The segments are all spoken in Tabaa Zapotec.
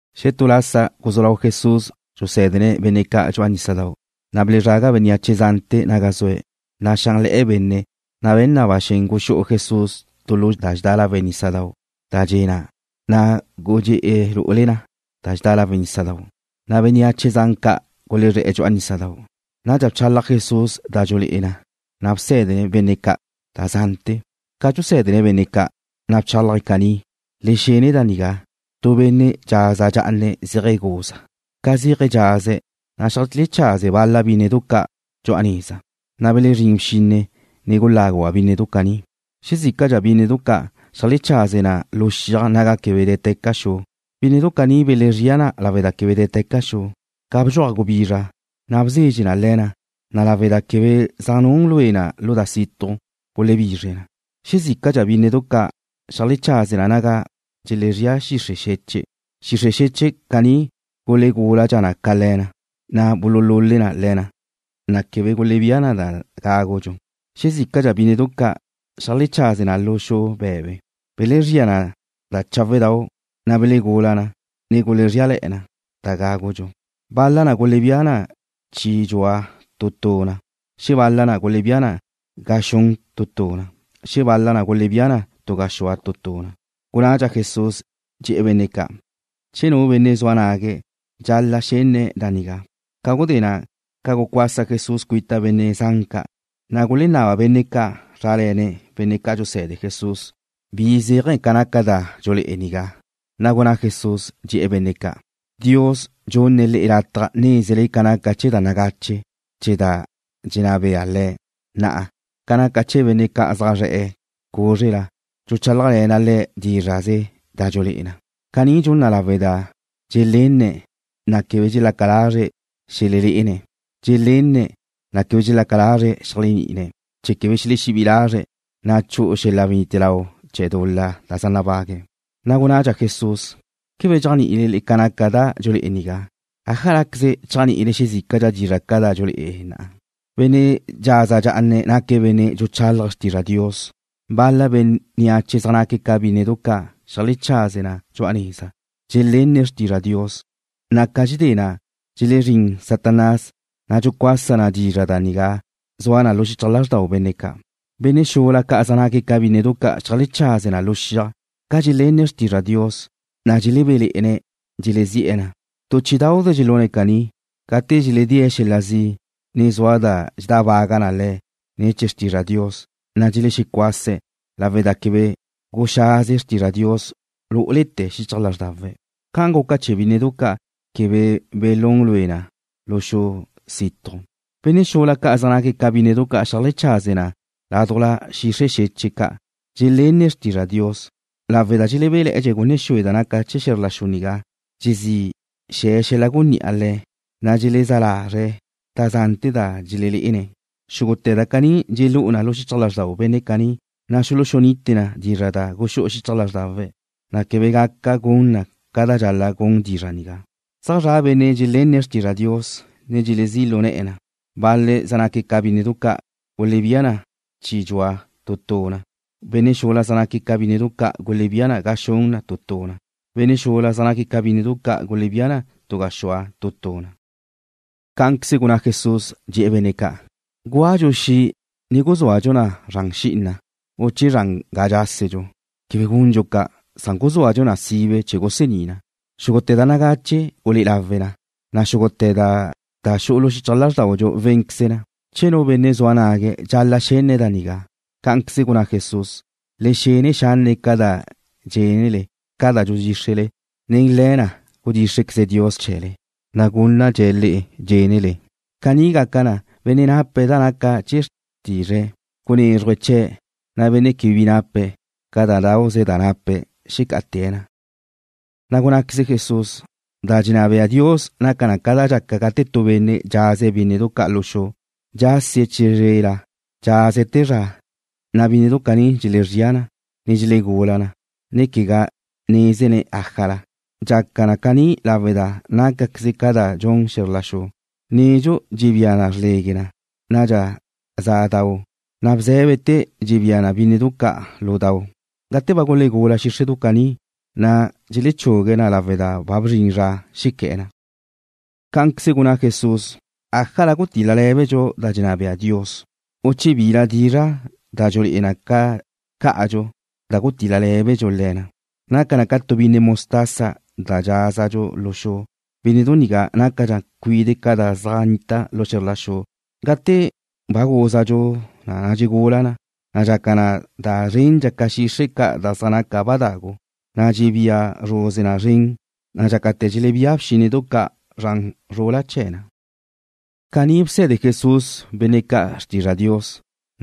Xetú lasa guzú lau Jesús dxusé̱dene̱' benne' ca' dxu'a nísadau', na' belezraga bénneache zante̱ naga zue̱'. Naxánle̱'e̱ benne', na' be̱n na ba xen guxú'u Jesús tu lu da dxedá lawe' nísadau' da dxe na', na' gudxé'e̱ lu'ule da dxedá lawe' nísadau', na' bénneache zan ca' gulezré̱'e̱ dxu'a nísadau'. Nadxa bchalaj Jesús da dxululé'e na, na' bsé̱dene̱' benne' ca' da zante̱. Ca dxusé̱dene̱' benne' ca', na' bchálaje̱' caní: ―Le xene da nigá. Tu benne' dxaza dxa'ana zéaje̱' guza. Ca zéaje̱' dxaze̱', na' xeajlechaze bal-la bínnedu ca' dxu'a neza. Na' belezrín bxinne, ne guláguba' bínnedu caní. Xezícadxa bínnedu ca' xeajlechaze na lu xiaj naga quebe dé̱teca xu. Bínnedu caní belezría na lawe' da quebe dé̱teca xu. Ca bdxuaj gubizra, na' bzezxe na le̱ na, na' lawe' da quebe zaj nun lue na lu da situj, gulebizre na. Xezícadxa bínnedu ca' xeajlechaze na naga dxelezría xixre' xeche'. Xixre' xeche' caní gulegúladxa na ca le̱ na, na' bululule na le̱ na, na' quebe gulebía na da gágudxu. Xezícadxa bínnedu ca' xeajlechaze na lu xu be̱be. Belezría na cháwedau', na' belegula na, ne gulezríale̱'e̱ na da gágudxu. Bal-la na gulebía na chi dxua tu tu na. Xebal-la na gulebía na ga xun tu tu na. Xebal-la na gulebía na tu gaxúa tu tu na. Gunnadxa Jesús, dxe̱'e̱ benne' ca': ―Che nu benne' zua nague̱', dxal-la' xenne̱' da nigá. Ca gudé na', ca gucuasa Jesús cuita benne' zan ca', na' gulenaba benne' ca' zrále̱ne̱' benne' ca' dxuse̱de Jesús bi zéaje̱ ca naca da dxulé'e nigá. Na' gunná Jesús, dxe̱'e̱ benne' ca': ―Dios dxunne̱' le'e lataj nézele ca naca chee̱ da nagache chee̱ da dxenná bea Le̱'. Na'a, ca naca chee̱ benne' ca' zaj zre̱'e̱ cúzrela, dxuchálajle̱na' le̱' dízra'ze da dxulé'e na. Caní dxuna' lawe' da dxelenné̱'e̱, na' quebe dxelaca lazre̱' xelelé'ene̱'. Dxelenne̱', na' quebe dxelaca lazre̱' xeléajni'ine̱', chee̱ quebe xelexebí'i lazre̱', na' chu'u xel-la wenite lau chee̱ dul-la da za nabague̱'. Na' gunnadxa Jesús: ―¿Quebe dxéajni'ile ca naca da dxulé'e nigá? ¿Ájalaqueze chéajni'ile xezícadxa dizra' ca' da dxululé'e na? Benne' dxaza dxá'ane̱' naque̱' benne' dxuchálaje̱' xrtizra Dios. Bal-la bénneache zaj naque̱' ca bínnedu ca' xeajlechaze na dxu'a neza. Dxelenne̱' xrtizra Dios, na' ca dxedé na', dxezrín Satanás, na' dxucuasa na dizra' nigá da zua na xichaj lázrdau benne' ca'. Benne' xula ca' zaj naque̱' ca bínnedu ca' xeajlechaze na lu xiaj. Ca dxelenne̱' xrtizra Dios, na' dxelebéle̱'e̱ne̱' dxelezi'e̱ na. Tu chí'idauze dxelune̱' caní. Gate dxeledée̱' xel-la zi', ne zua da dxedábaga le̱' ne̱ chee̱ xrtizra Dios, na' dxelexecuase̱' lawe' da quebe guxaze xrtizra Dios lú'ulete̱ xichaj lázrdawe̱' ca guca chee̱ bínnedu ca' quebe belún lue na lu xu situj. Benne' xula ca' zaj naque̱' ca bínnedu ca' xeajlechaze na ládujla xixre' xeche' ca'. Dxelenne̱' xrtizra Dios. Lawe' da dxelebe'dxe̱' gunne xue da naca chee̱ xe̱zr la xu nigá dxezí xe̱ xel-la gunní'a le̱', na' dxelezá lazre̱' da zante̱ da dxelelé'ene̱'. Xúgute̱ da caní dxelú'u na xichaj lázrdau benne' caní, na' xuluxunite na dizra' da guxú'u xichaj lázrdawe̱', na' quebe gaca gun na ca da dxal-la' gun dizra' nigá. Zaj zra' benne' dxelenne̱' xrtizra Dios, ne dxelezí' lu ne̱'e̱ na. Bal-le̱' zaj naque̱' ca bínnedu ca' gulebía na chi dxua tu tu na. Benne' xula zaj naque̱' ca bínnedu ca' gulebía na ga xun tu tu na. Benne' xula zaj naque̱' ca bínnedu ca' gulebía na tu gaxúa tu tu na. Cá'anqueze gunná Jesús, dxe̱'e̱ benne' ca': ―¿Gúadxu xi', ne guzúadxu na zran xi'ina u che zran ga dxásedxu? Quebe gundxu ca', san guzúadxu na sibe chee̱ gusení na. Xúgute̱ da nagache gulé'e lawe na, na' xúgute̱ da xu'u xichaj lázrdaudxu wénqueze na. Che nu benne' zua nague̱', dxal-la' xenne̱' da nigá. Cá'anqueze gunná Jesús: ―¡Le xene xanne' ca da dxénele! Ca da dxudxíxrele, nen le̱ na' gudxíxrequeze Dios chee̱le, na' gúnnadxe̱' le'e dxénele. Caní gaca na, benne' nape̱' da naca chee̱ xrtizre̱'e, gunézrujdxe̱' chee̱', na' benne' quebe bi nape̱', ca da dauze da nape̱' xecá'ate̱' na. Na' gunnáqueze Jesús: ―Da dxenná bea Dios naca na ca da dxaca gate tu benne' dxaze̱' bínnedu ca' lu xu. Dxásie̱' chizrela, dxase̱' te zra, na' bínnedu caní dxelezría na, ne dxelegula na, ne quegá nézene̱' ájala. Dxaca na caní lawe' da nácaqueze ca da dxun xe̱zr la xu. Nedxu dxebía na xrlegue na, nadxa za dau, na' bzé̱bete̱ dxebía na bínnedu ca' lu dau. Gate ba gulegula xíxredu caní, na' dxechugue̱' na lawe' da ba bzrin zra xequé̱'e̱ na. Cá'anqueze gunná Jesús: ―¿Ájala gutil-la lé̱bedxu da dxenná bea Dios, u che bila dizra' da dxulé'e na cá'adxu da gutil-la lé̱bedxu le̱ na? Naca na ca tu binne mostaza da dxázadxu lu xu. Bínnedu nigá nácadxa cuide' ca da zaj nnita lu xe̱zr la xu. Gate ba gúzadxu na dxegula na, na' dxaca na da zrendxa ca xixre' ca' da zaj naca na ba dagu, na' dxebía zruze na zren, na' dxácate̱ dxelebía bxínnedu ca' zran zrula chee̱ na. Caní bse̱de Jesús benne' ca' xrtizra Dios,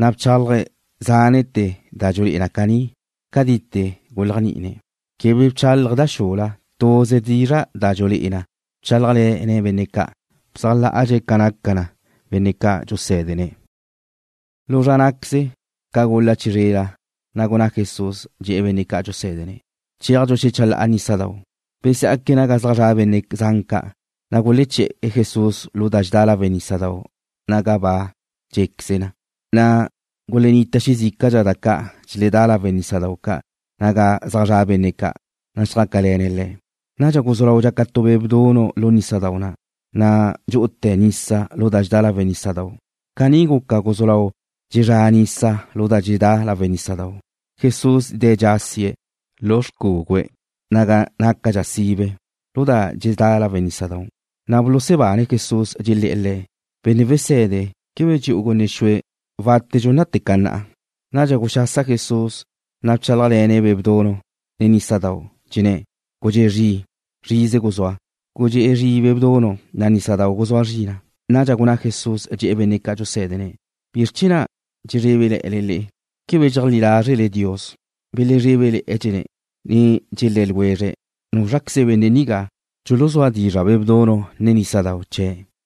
na' bchálaje̱' zánete̱ da dxululé'e na caní, cadite̱ guléajni'ine̱'. Quebe bchálaje̱' da xula. Tuze dizra' da dxulé'e na bchálajle̱ne̱' benne' ca'. Bzájla'adxe̱' ca naca na benne' ca' dxusé̱dene̱'. Lu zra ná'queze, ca gul-la chizrela, na' gunná Jesús, dxe̱'e̱ benne' ca' dxusé̱dene̱': ―Chéajdxu xecha la'a nísadau'. Besá'aque̱' naga zaj zra' benne' zan ca', na' guleché̱'e̱ Jesús lu da dxedá lawe' nísadau' naga ba dxé'queze̱', na' gulennita xezícadxa da ca' dxeledá lawe' nísadau' ca' naga zaj zra' benne', na' xjácale̱ne̱' Le̱'. Nadxa guzú lau dxaca tu be' bdunu' lu nísadau' na', na' dxu'ute̱ nisa lu da dxedá lawe' nísadau'. Caní guca guzú lau dxezrá nisa lu da dxedá lawe' nísadau'. Jesús de̱' dxasie̱' lu xcúgüe̱' naga nácadxa sibe lu da dxedá lawe' nísadau'. Na' bulusebane̱' Jesús, dxelé̱'e̱ Le̱': ―Benne' wese̱de, ¿quebe dxe'u gunne xue wátedxu nate ca na'a? Nadxa guxasa Jesús, na' bchálajle̱ne̱' be' bdunu', ne nísadau'. Dxenné̱': ―¡Gudxé zri'! ¡Zrize guzúa! Gudxé zri' be' bdunu', na' nísadau' guzúa zri na. Nadxa gunná Jesús, dxe̱'e̱ benne' ca' dxusé̱dene̱': ―¿Bizr chee̱ na' dxezrébele̱'e̱le le'e? ¿Quebe dxeajlí lázrele Dios? Belezrébele̱'e̱dxe̱', ne dxelé̱ ljwezre̱': ―¿Núzraqueze benne' nigá? Dxuluzúa dizra' be' bdunu', ne nísadau' chee̱'.